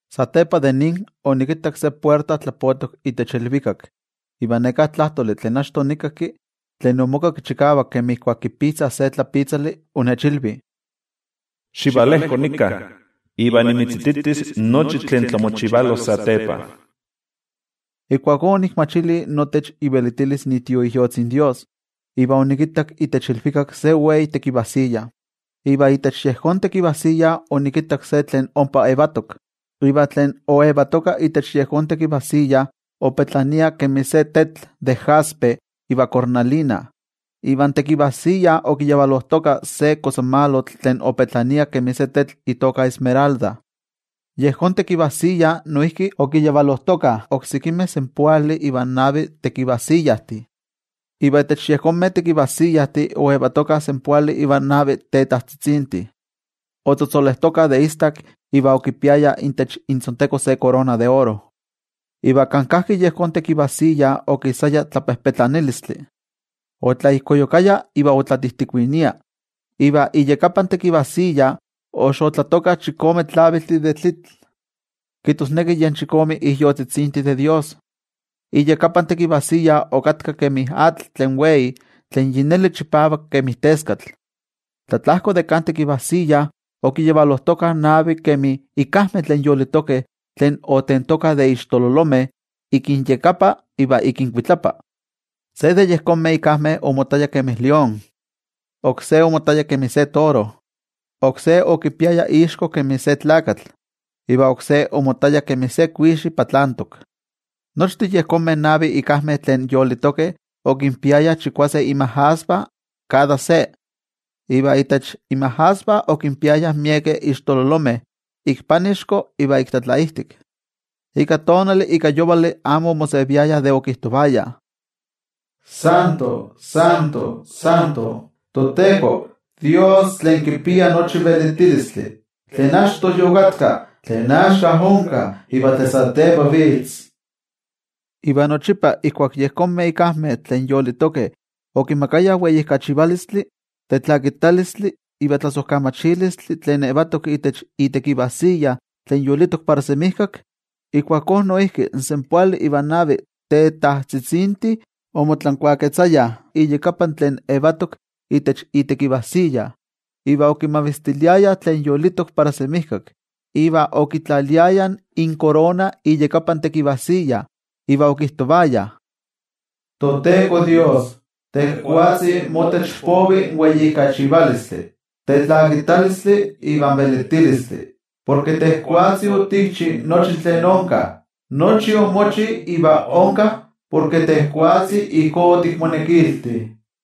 Satepa de nin, onikittak se puerta tlapotok itech ilvikak. Iva neká tlajtoli tlen achto onikakki, tlen omokakki chikavak kemi ijkuak kipitzah se tlapitzali, onechilvi: —Xivalejko nika, iva nimitzititis nochi tlen tlamochivalos satepa. Ijkuakó onikmachili notech ivelitilis iTioijyotzi in toYejwatzi, iva onikittak itech ilvikak se wei tekivajsiya, iva itech yejón tekivajsiya onikittak se tlen ompa yetok. Iva tlen oyetoka itech yejón tekivajsiya opetlania kemi se tetl de jaspe iva cornalina. Iva in tekivajsiya okiyavalojtoka se kosamalotl tlen opetlania kemi se tetl itoka esmeralda. Yejón tekivajsiya noijki okiyavalojtokah oksekimeh senpoali ivan navi tekivajsiyajtih, iva itech yejonmeh tekivajsiyajtih oyetokah senpoali ivan navi tetajtzitzintih, otzotzolejtokah de istak iva okipiayah itech intzonteko se korona de oro. Iva kan kajki yejón tekivajsiya okisaya tlapejpetlanilistli, otlaijkoyukaya iva otlatijtikuinia. Iva iyakapan tekivajsiya oxotlatokah chikome tlaviltih de tlitl, kijtosneki yen chikome ijyotzitzintih de toYejwatzi. Iyakapan tekivajsiya okatka kemi atl tlen wei tlen yi neli chipavak kemi teskatl. Tlatlajko de kan tekivajsiya okiyavalojtokah navi kemi ikajmeh tlen yolitokeh tlen otentokah de ixtololomeh ik inyakapa iva ik inkuitlapa. Se de yejonmeh ikajmeh omottaya kemi se lión, oksé omottaya kemi se toro, oksé okipiaya ixko kemi se tlakatl, iva oksé omottaya kemi se kuixi patlantok. Nochtin yejonmeh navih ikajmeh tlen yolitokeh okinpiayah chikuase inmajasvah kada se, iva itech inmajasvah okinpiayah miekeh ixtololomeh ik panixko iva ik tlatlaijtik. Ika tonali ika yovali amo omoseviayah de okijtovayah: Santo, Santo, Santo, toTeko, Dios tlen kipia nochi velitilistli, tlen achto yokatka, tlen axka onka iva tlen satepa vitz. Iva nochipa ijkuak yejonmeh ikajmeh tlen yolitokeh okimakayah weijkachivalistli, tetlakitalistli iva tlasojkamachilistli tlen yetok itech itekivajsiya tlen yolitok para semijkak, ijkuakó noijki in senpoali ivan navi tetajtzitzintih omotlankuaketzayah iyakapa tlen yetok itech itekivajsiya, iva okimavistiliayah tlen yolitok para semijkak, iva okitlaliayah inkorona iyakapan tekivajsiya, iva okijtovayah: ToTeko Dios, tejwatzi motech povi in weijkachivalistli, in tetlakitalistli iva in velitilistli. Porke tejwatzi otikchi nochi tlen onka, nochi omochi iva onka porke tejwatzi ijkó otikmonekilti.